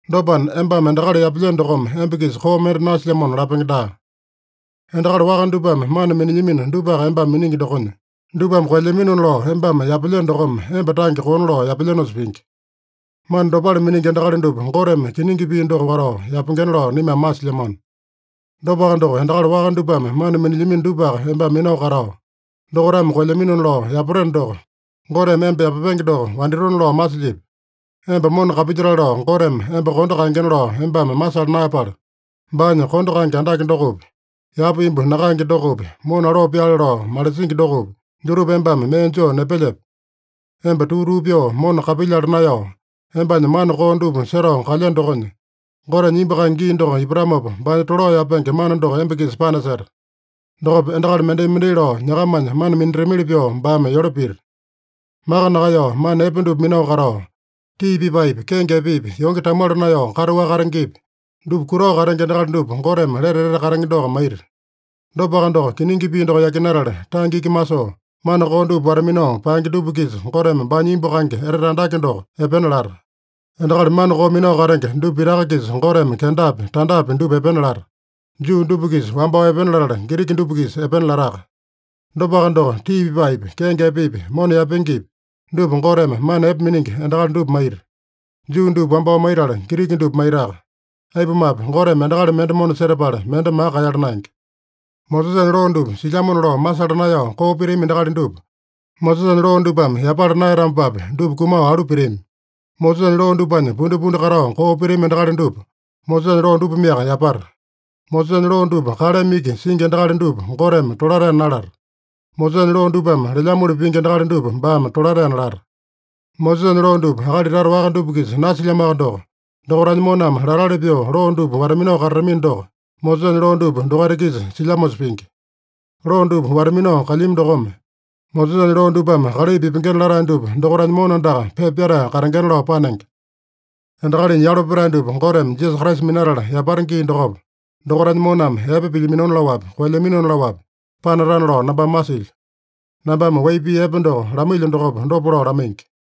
Dopana, embame endakali yapelyeno dokome emba-kisa koo mende nasilyamona lapenge daa. Endakali waka dupame mana minilyamino dupaka embame miningi dokonya, dupame koelyaminona lao embame yapelyeno dokome emba tange koona lao yapelyenosa pingi. Mana dopale miningi endakali dupa Goteme kiningi pii doko watao yapengena lao naimame masilyamano. Dopaka doko, endakali waka dupame mana minilyamino dupaka embame minao katao, dokaitame koelyaminona lao yapateno doko, Goteme emba yapapenge doko wanditona lao masilyipi? Emba mona kapilyatale lao Goteme emba kondo kaengena lao embame masala naeyapala, baanya kondo kaenge andake dokopi, yapa imbu nakaenge dokopi, mona aloo pyaale lao malisingi dokopi, dutupa embame mee joo nepelyepe? Emba tuu-tuu pyoo mona kapilyala naeyao, embanya mana koo dupa setao kalyeno dokonya, Gotenya imbu kaenge gii doko ipatamopa, baanya tolao yapenge mana doko emba-kisa panaseta. Dokopa endakali mendai-mendai lao nyakamanya mana minatamili pyoo baame yole pita. Maka nakaeyao mana epe dupa minao katao, tii pipaepi, kenge epepi, yonge tamuala naeyao kataowaka katengepi, dupa kutao katenge endakali dupa Goteme lete etete katenge doko maita. Dopaka doko, kiningi pii doko yakinatala, tange iki masoo, mana koo dupa wata-minao paenge dupa-kisa Goteme baanya imbu kaenge etete andake doko epena lata. Endakali mana koo minao katenge dupa pitaka-kisa Goteme kendapi, tandapi dupa epena lata. Juu dupa-kisa wambao epena latala, Giriki dupa-kisa epena lataka. Dopaka doko, tii pipaepi, kenge epepi, mona yaepengepi, dupa Goteme mana epe miningi endakali dupa maita. Juu dupa wambao maitala, Giriki dupa maitaka. Aipumape, Goteme endakali mende mona setapala, mende maka kaeyala naenge. Mosesanya loo dupa silyamona lao masala naeyao koo pitami endakali dupa, Mosesanya loo dupame yapala naeyatamopapi, dupa kumao alu pitami. Mosesanya loo dupanya pundipundi katao koo pitami endakali dupa, Mosesanya loo dupameaka yapata. Mosesanya loo dupa kaleme iki singi endakali dupa Goteme tolataena nalata. Mosesanya loo dupame lelyamoli pingi endakali dupa baame tolataena lata. Mosesanya loo dupa akali tata waka dupa-kisa nasilyamoaka doko, dokaitanya moname latali pyoo loo dupa wata-minao katatamino doko, Mosesanya loo dupa dokaita-kisa silyamosa pingi. Loo dupa wata-minao kalyami dokome, Mosesanya loo dupame kalai pipengena latae dupa dokaitanya mona andaka pepa pyatae katengena lao panenge. Endakalinya yalo petae dupa Goteme Jisasa Kraisa minatala yapata gii dokopa, dokaitanya moname epe pilyaminona laowapi, koelyaminona laowapi panatana lao nambame masilyo. Nambame wai pii epe doko lamailyo dokopa dopa lao lamaingi.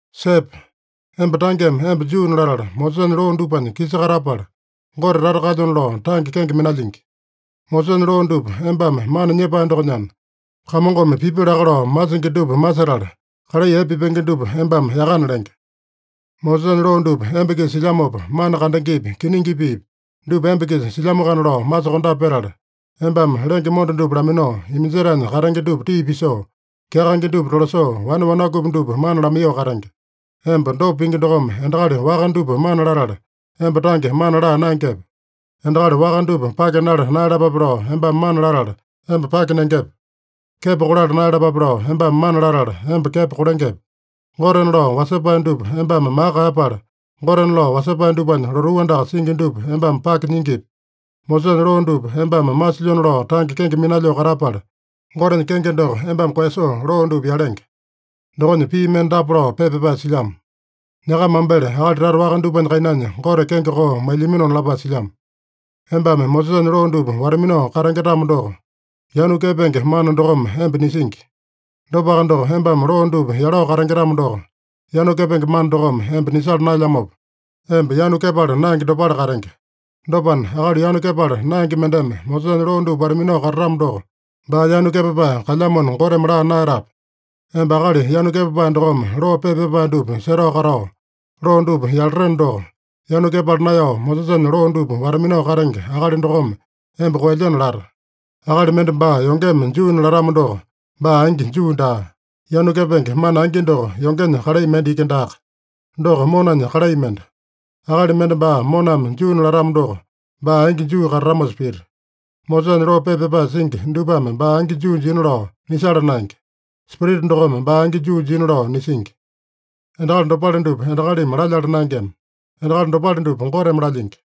Sepe! Emba tangeme emba Juuna latala, Mosesanya loo dupanya kisa katapala, Gote tata kalyona lao tange kenge minalyingi. Mosesanya loo dupa embame mana nyepae dokonyana, Kamongome pipi laka lao masingi dupa masetala, kalai epe pipenge dupa embame yakana lenge. Mosesanya loo dupa emba-kisa silyamopa, mana kandengepi, kiningi piipi, dupa emba-kisa silyamoakana lao masokondape petala, embame lenge monda dupa laminao, iminjetaenya katenge dupa tii pisoo, kyakaenge dupa tolasoo, wane wanakupi dupa mana lamaiyoo katenge. Emba dopa pingi dokome endakali waka dupa mana latala, emba tange mana laa naengepe? Endakali waka dupa pake nala naeyalapape lao embame mana latala, emba pake nengepe? Kepo kolala naeyalapape lao embame mana latala, emba kepo kolengepe? Gotena lao wasepae dupa embame maka kaeyapala, gotena lao wasepae dupanya lotuu andaka singi dupa embame pake nyingipi? Mosesanya loo dupa embame masilyona lao tange kenge minalyoo katapala, Gotenya kenge doko embame koeyasoo loo dupa yalenge. Dokonya pii mende dapa lao pepa pyapae silyamo: “Nyakama mambele akali tata waka dupanya kainanya Gote kenge koo mailyaminona” lapae silyamo. Embame Mosesanya loo dupa wata-minao katenge-tamo doko, yanu kepenge mana dokome emba nisingi. Dopaka doko, embame loo dupa yalao katenge-tamo doko, yanu kepenge mana dokome emba nisala naelyamopa, emba yanu kepala naenge dopale katenge. Dopana, akali yanu kepala naenge mendeme Mosesanya loo dupa wata-minao katatamo doko, baa yanu kepapae kalyamona Goteme laa naeyatape? Emba akali yanu kepapae dokome loo pepa pyapae dupa setao katao, loo dupa yalateno doko, yanu kepala naeyao Mosesanya loo dupa wata-minao katenge akali dokome emba koelyeno lata. Akali mende baa yongeme Juuna latamo doko, baa angi Juu daa. Yanu kepenge mana angi doko, yongenya kalai mende iki daaka. Doko monanya kalai mende. Akali mende baa moname Juuna latamo doko, baa angi Juu katatamosa pita. Mosesanya loo pepa pyapae singi dupame baa angi Juu jina lao nisala naenge. Spirita dokome baa angi Juu jina lao nisingi. Endakali dopale dupa endakalimi lalyala naengema. Endakali dopale dupa Goteme lalyingi.